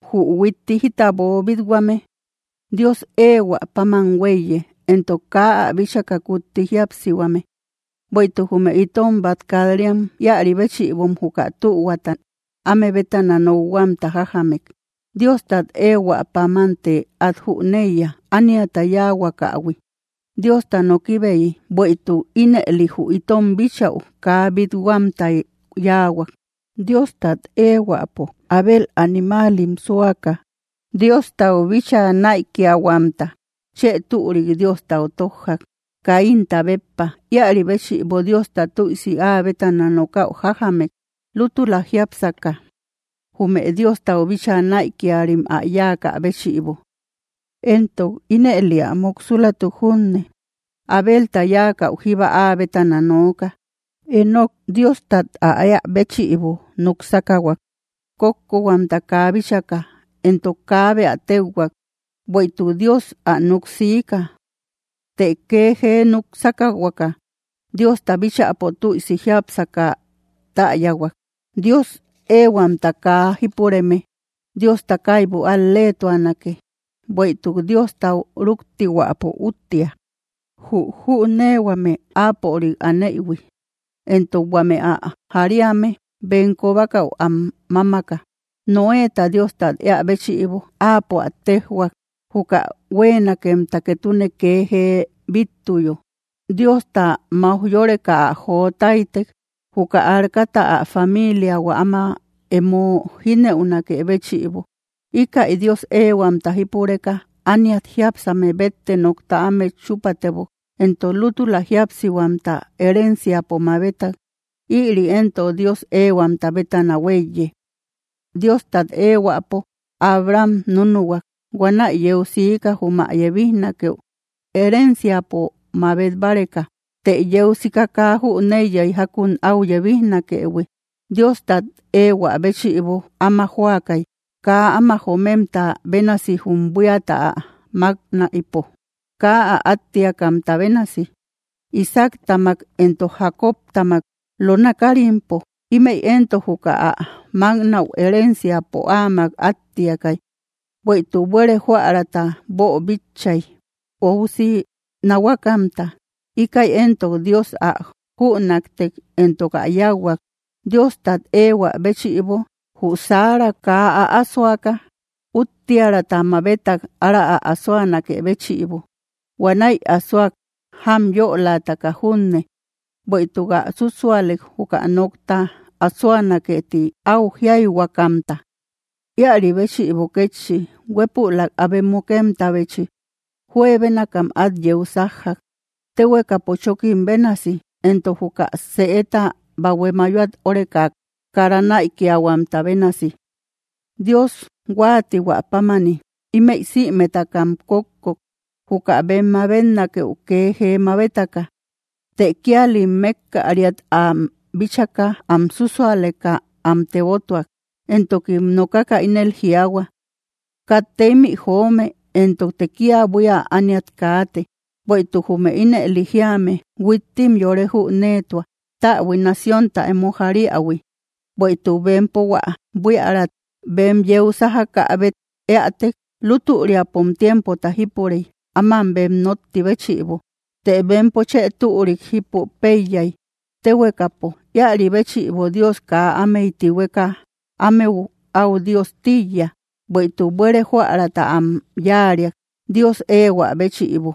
Jü huitti jita boobit-huame, Dios éehuä páman huéiye, entok kaa ä bíchaka kutti jíapsihuame. Bueïtuk jume itom bát kat‑riam íäri béchïbom juka tühuata áme bétana nokhuamta jájamek. Diostat éehuäpámante át jüneiya ániata yáahuakahui, Diosta nokibeyi, bueïtuk ínëli jü itom bíchäu, kaa bít-huamtay yáahuak. Diostat éehuäpo Abel animaalim súaka Diostau bíchaa näikiahuamta chë türik Diostau tójjak, Caínta béppa. Íäri béchïbo Diosta tüisi áa bétana nokäu jájamek, lútula jiápseka jume Diostau bíchaa näikiarim ä yáakä béchïbo. Éntok ínëli ä muksulatuk junne, Abelta yáakäu jíba áa bétana nooka. Enoc Diostat ä éä béchïbo núk sákahuak, kókkohuamta kaa bíchaka. Entok kaabe ä téuhuak, bueïtuk Dios ä nuk siika. Të kee jee núk sákahuaka, Diosta bíchäpo tüisi jiápsaka täyahuak. Dios éehuamta kaa jípureme Diosta kaibu al-leetuanake, bueïtuk Diostau rúktihuäpo úttia, jü jüneehuame Áapörik anëhui, entok huame ä jariame bem kobakäu am mámaka. Noéta Diostat éä béchïbo, Áapo ä téjhuak, juka huéenakemta ketune kee jee bíttuyo. Diosta mauj yöreka ä jotáytek, juka arcata, ä familiahua áma emo jínëunakë béchïbo. Íkäi Dios éehuamta jípureka ániat jiápsame bette nokta ámet chúpatebok, entok lútula jíapsihuamta herenciapo mabetak. Ïri éntok Dios éehuamta bétana huéiye. Diostat éehuäpo Abraham núnuhuak. Huanäi yeu siika, jum ä yebijnakeu herenciapo mabet báreka. Të yeu sika kaa jüneiyay jákun áu yebijnakëhui. Diostat éehuä béchïbo áma jóakay, kaa áma jomemta bénasi jum buíata ä máknaïpo, kaa ä áttiakamta bénasi, Isaactamak entok Jacobtamak lona kárimpo. Ímëi éntok juka ä máknäu herenciapo áamak áttiakay. Bueïtuk buére jóäraata boobíchaïhuiy, óusi nahuakamta. Íkäi éntok Dios ä jünaktek, entok ä yáuhuak. Diostat éehuä béchïbo jü Sara kaa äasoaka, úttiäraata mabetak ára ä asoanakë béchïbo. Huanäi asoak jamyölataka junne, bueïtuk ä súsualek, juka nokta asoanakee, ti áu jíayhuakamta. Íäri béchïbo kétchi, huépülak abe mukemtabechi juebénakam át yeu sájjak, téekapo chókim bénasi, entok juka sëeta bahue mayoat óreka kara näikiahuamta bénasi. Dios huáatihuä pámani, ímëi sïmetakam kókkok, juka bem mabetnakëu kee jee mabetaka. Të kíalim mékkariat am bíchaka am súsualeka am tebotuak. Entokim nokaka ínel jiaahua: “Katte ímï joome, entokte kia buía ániat kaate.” Bueïtuk jume ínëli jíame, huittim yore jüneetua, täbui naciónta emo jariähui. Bueïtuk bempo hua buíärat bem yeu sájakäbet éätek, lútüriapom tiempota jípurey áman bem nótti béchïbo. Të bempo chë türik jípu péiyay, téhuekapo. Íäri béchïbo Dios kaa ámey tihueka ámeu áu Dios tíiya, bueïtuk buere jóäraata am yáariak. Dios éehuä béchïbo,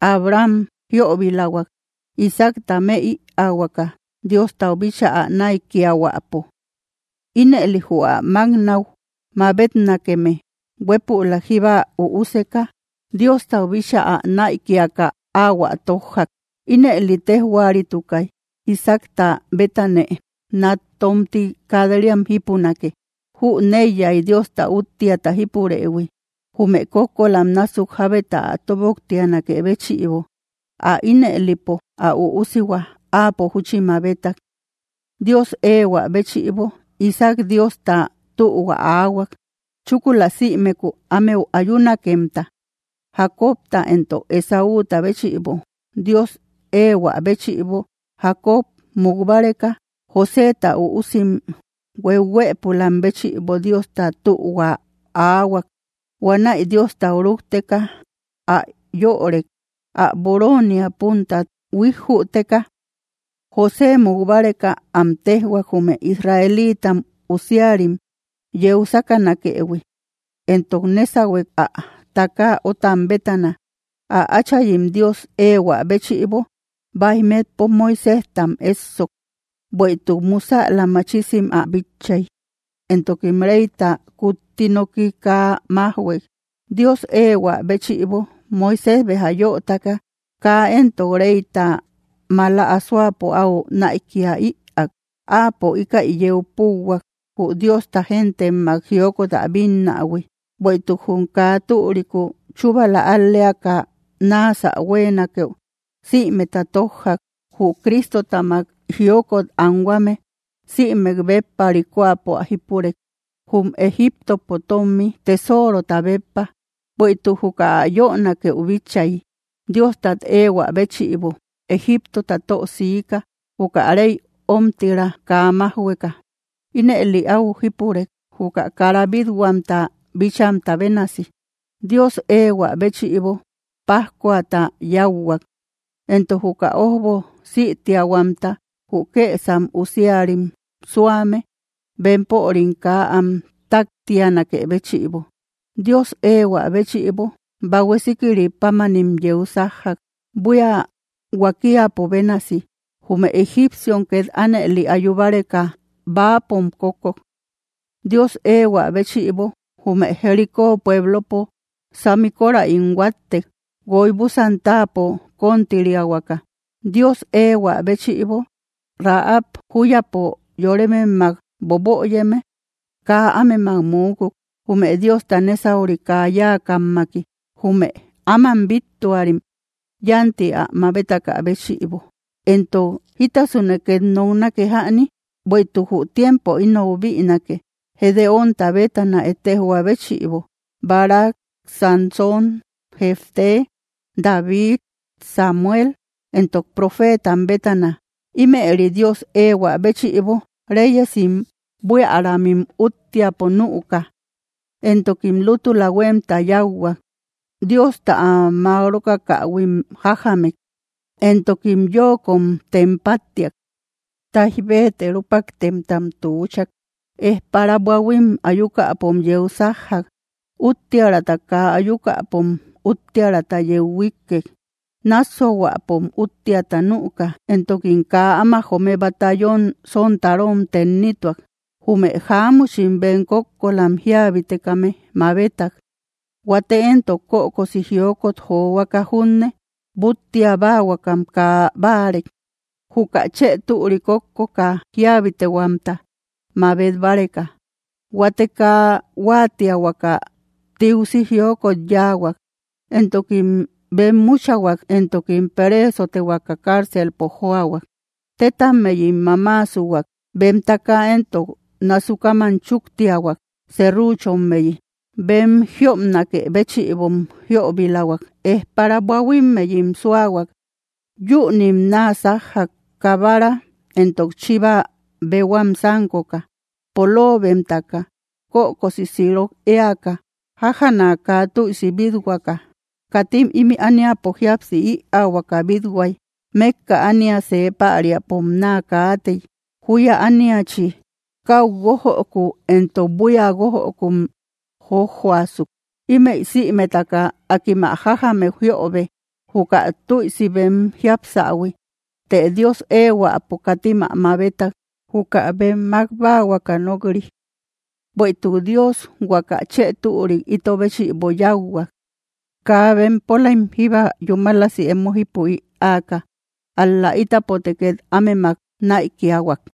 Abraham jiöbilahuak Isaacta më ïaahuaka Diostau bíchaa ä näikiahuäpo. Ínëli jü ä máknäu mabetnakeme huépülak jíba üuseka Diostau bíchaa ä näikiaka áahuä tójjak. Ínëli téjhuaritukay: “Isaacta betanë nat tómti kat‑riam jípunake.” Jüneiyay Diosta úttiata jípurëhui, jume kókkolam násuk jábeta ä tóbnoktianakë béchïbo. Ä ínëlipo, ä üusihua áapo júchi mabetak. Dios éehuä béchïbo, Isaac Diosta tühua aahuak, chúkula sïmeku ámeu ayunakemta, Jacobta entok Esáuta béchïbo. Dios éehuä béchïbo Jacob, muk báreka, Joséta üusim hueuhuëpulam béchïbo Diosta tühua aahuak. Huanäi Diostau rúkteka ä yörek, ä boroonia puntat huíjjüteka. José muk báreka am téjhuak, jume israelita usiarim yeu sákanakëhui, entok nésahuek ä takaa ótam bétana. Ä áchayim Dios éehuä béchïbo báij metpo Moiséjtam éssok, bueïtuk musäla machisim ä bitchay, entokim reyta kutti noki kaa májhuek. Dios éehuä béchïbo Moisés, béja yötaka kaa entok reyta mala asoapo áu näikia ïak. Áapo íkäi yeu púuhuak, jü Diosta gentemak jiokot ä bínnähui, bueïtuk jum kaa türiku chúbala al‑leaka náasä huéenakeu, sïimeta tójjak. Jü Cristotamak jiokot anhuame sïmek béppa ríkoapo ä jípurek, jum Egiptopo tómi tesorota béppa, bueïtuk juka ä yönakeu bitchay. Diostat éehuä béchïbo Egiptota tö siika, juka reyta ómtira kaa májhueka. Ínëli áu jípurek, juka kara bít-huamta bíchamta bénasi. Dios éehuä béchïbo pájkuata yáuhuak, entok juka ójbo sïtiahuamta, jü kësam usiarim súame bempörim kaa am táktianakë béchïbo. Dios éehuä béchïbo Bahue Síkiri pámanim yeu sájjak, buía huakiapo bénasi. Jume egipciom két ánëli ayu báreka, bäapom kókkok. Dios éehuä béchïbo jume Jericó pueblopo sami kóräim huáttek, guoy búsan táapo kontiriähuaka. Dios éehuä béchïbo Rahab júyapo yorememmak boböyeme kaa ámemak muukuk, jume Diosta nésauri kaa yáakammaki, jume áman bíttuarim yánti ä mabetakä béchïbo. Entok, ¿jítasune két noknake jäni? Bueïtuk jü tiempo inou bïnake, Gedeónta bétana ettejjoa béchïbo, Barac, Sansón, Jefté, David, Samuel, entok profeetam bétana. Ímëri Dios éehuä béchïbo reyesim buiäramim úttiapo nüuka, entokim lútula huémta yáuhuak, Diosta am mák rókakähuim jájamek, entokim yóokom tem páttiak. Táij béete rúpaktemtam tuuchak; ejpara buahuim ayukäpom yeu sájjak; úttiäraata kaa ayukäpom úttiäraata yeu huíkkek; nássuahuäpom úttiata nüuka; entokim kaa áma joome batallón sontarom tennituak. Jume jáamuchim bem kókkolam jíabitekame mabetak. Huate éntok kökosi jiokot johuaka junne, búttia báahuakam kaa báarek, juka chë türi kókkoka jíabitehuamta mabet báreka. Huate kaa huáatiahuaka tiusi jiokot yáahuak, entokim benmuchahuak, entokim pereesotehuaka cárcelpo jóahuak. Tétammeyim mamaasuhuak; bem takaa éntok nasukaman chúktiahuak serruchommeyi; bem jiopnakë béchïbom jiöbilahuak; ejpara buahuimmeyim súahuak. Yünim naa sájjak, kabara entok chiva béhuam sánkoka, poloobemtaka, kökosi sirok éaka, jájana kaa tüisi bít-huaka. Katim ímï ániapo jíapsi ïaahuaka bít-huay. Mékka ánia see päriapom naa kaatey, júya ániachi. Káu guójöku entok buía guójökum jójjoasuk. Ímëi sïmetaka, akim ä jájamek jiöbe, juka tüisi bem jiapsähui. Të Dios éehuäpo katim ä mabetak, juka bem mák báahuaka nok‑ri. Bueïtuk Dios huaka chë türik ito béchïbo yáuhuak, kaa bempolaim jíba yúmalasi emo jípu ïaaka, ál‑la ítapote két ámemak näikiahuak.